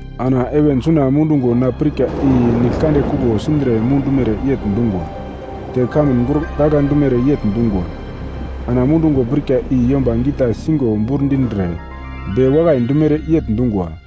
Ana heven suna mudungo na pirka i nigl kande kuglo sindre mudumere yegl dungwa. Te kamun gurgagla dumere yegl dungwa. Ana mudungo pirka i yomba gita sigo bur dindre be wakai dumere yegl dungwa.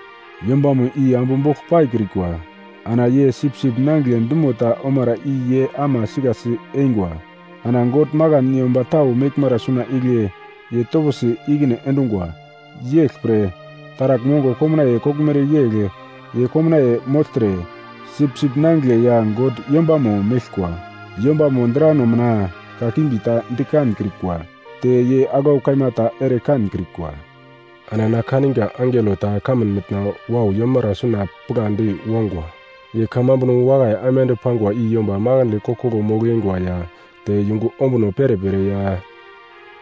Yombamo i ambu bogl paikrikwa, ana ye Sipsip Nangigle dumo ta omara i ye ama sikasi eingwa. Ana God makan yomba tau meglmara suna igle ye toposi ikine endungwa. Yeglpre taragl mongo komnaiye koglmere yegl ye komnaiye mogltre, Sipsip Nangigle ya God yombamo meglkwa. Yombamo drano mina kakimbi ta di kankrikwa. Te ye aglau kaima ta ere kankrikwa. Ana na kaniga angelo ta kamun mitna wau yomara suna pigladi wongwa, ye kamambuno wakai aimande pangwa i yomba makandle koglkoglo mogl-eingwa ya te yungu ombuno perepere ya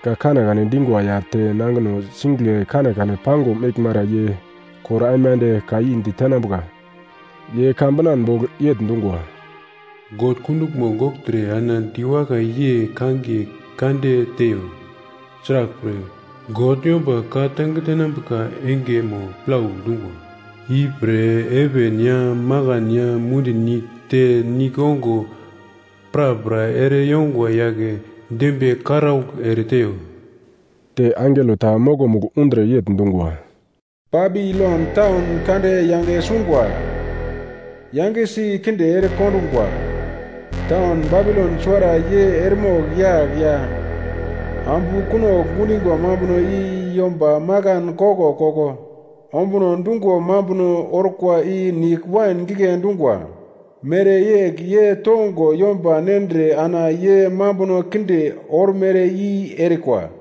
ka kanekane dingwa ya te nangino singigle kanekane pango meglmara ye kor aimande ka i ditenambuka. Ye ka binan bogl yegl dungwa, “God kunduglmo gogltre ana diwakai yei kangiye kande teiyo; sraglpre, God yomba ka tange tenambuka engemo plau dungwa. Ipre, heven ya makan ya mundi nigl te nigl ongo prapra ere yongwa yagle dembiye karaugl ereteiyo.” Te angelo ta mokomugl undre yegl dungwa, “Babilon taun kande yange sungwa! Yangesi kinde erekondungwa! Taun Babilon suwara ye eremogl yagl ya ambu kunogl gundingwa mambuno i yomba makan koglkoglo ombuno dungo mambuno orkwa i nigl wain gigle dungwa mereyegl ye tongo yomba nendre ana ye mambuno kinde ormere i erikwa.”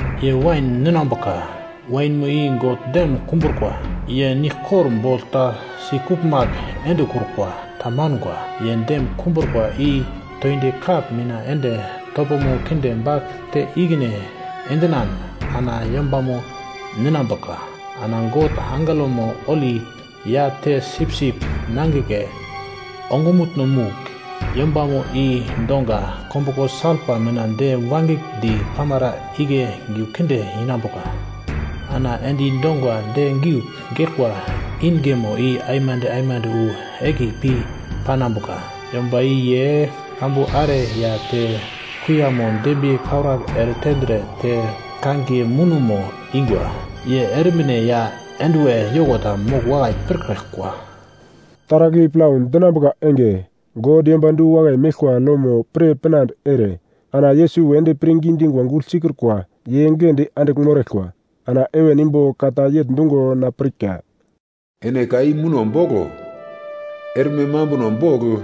ye wain ninambuka. Wainmo i God dem kumbrukwa. Ye niglkor bogl ta sikuglmagl endekrukwa, tamanga. Ye dem kumbrukwa i toindi kap mina ende topomo kinde bagl te ikine endinan ana yombamo ninambuka. Ana God angelomo holi ya te Sipsip Nangigle ongumutno-mugl yombamo i donga kombuglo salpa mina de wangigldi pamara igle giu kinde inambuka. Ana endi dongwa de giugl geglkwa ingemo i aimande aimande wu egli pi panambuka. Yomba i ye kambu are ya te kuiyamo dembiye karaugl eretendre te kangiye munomo ingwa, ye ermine ya enduwer yoko ta mogl wakai pirkraglkwa.” Taragl i plau dinambuka enge God yomba du-wakai meglkwa lomo pir pinande ere ana Yesus wedi pirngi dingwa gugl sikrukwa ye giglendi andigl moraglkwa. Ana heven imbo ka ta yegl dungo na pirka, “Ene ka i muno boglo. Erme mambuno bogl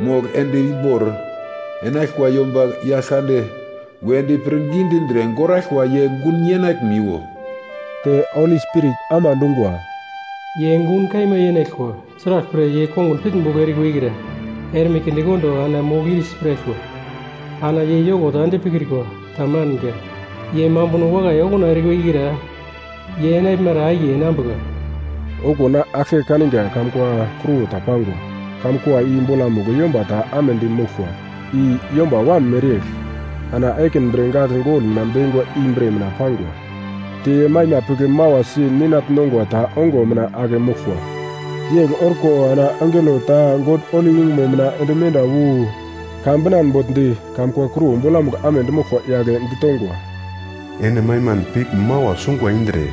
mogl ende imbor enaglkwa yomba Yaglkande wedi pirngi dindre goraglkwa ye gun yenaglimiwo.” Te Holi Spirit ama dungwa, “Ye gun kaima yenaglkwa; sraglpre, ye kongun pitnbogl erikwa ikra erme kindekondo ana mogl ir si piraglkwa. Ana ye yoko ta ende pikrikwa. Tamanga. Ye mambuno wakai okuna erikwa ikra ye enaglmara akiye enambuka.” Okuwo na aglke kanga kamun kua kruwo ta pangwa. Kamun kua i bolamugl yomba ta amedi moglkwa, i “yomba wam mereyegl.” Ana ekin bre gagl gol mina bekingwa i bre mina pangwa. Te ye maima pigl mawasi ninagl nongwa ta ongo mina ake moglkwa. Yegl orko ana angelo ta God holi yungumo mina ende menda wu ka binan bogl di kamkua kruwo bolamugl amedi moglkwa yagle ditongwa, “Ene maiman pigl mawa sungwa indre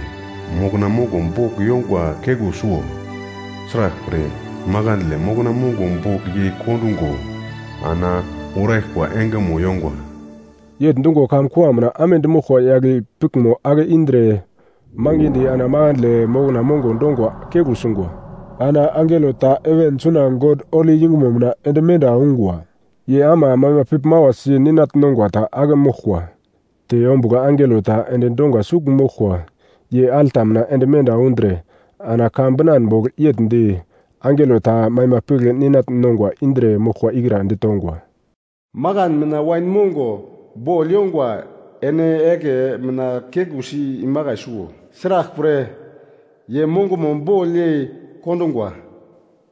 mokna mongo bogl yongwa keglu suwo; sraglpre, makandle mokna mongo bogl yei kondungo ana uraglkwa engemo yongwa.” Yegl dungo kamkua mina amedi moglkwa yagle piglmo ake indre mangidi ana makandle mokna mongo dongwa keglu sungwa. Ana angelo ta heven suna God holi yungumo mina ende menda ungwa. Ye ama maima pigl mawasi ninagl nongwa ta ake moglkwa. Te ombugl angelo ta endi donga sugl moglkwa ye alta mina ende menda undre ana ka binan bogl yegl di angelo ta maima pigl ninagl nongwa indre moglkwa ikra ditongwa: “Makan mina wain mongo bogl yongwa ene egle mina keglusi imakai suwo. Sraglpre, ye mongomo bogl yei kondungwa.”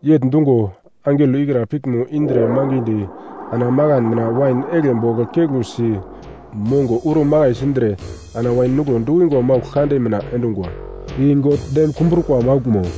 Yegl dungo angelo ikra piglmo indre mangidi ana makan mina wain eglke bogl keglusi mongo uro makai sindre ana wain nuglo dukingwa maugl kande mina endungwa, i God dem kumbrukwa mauglmo.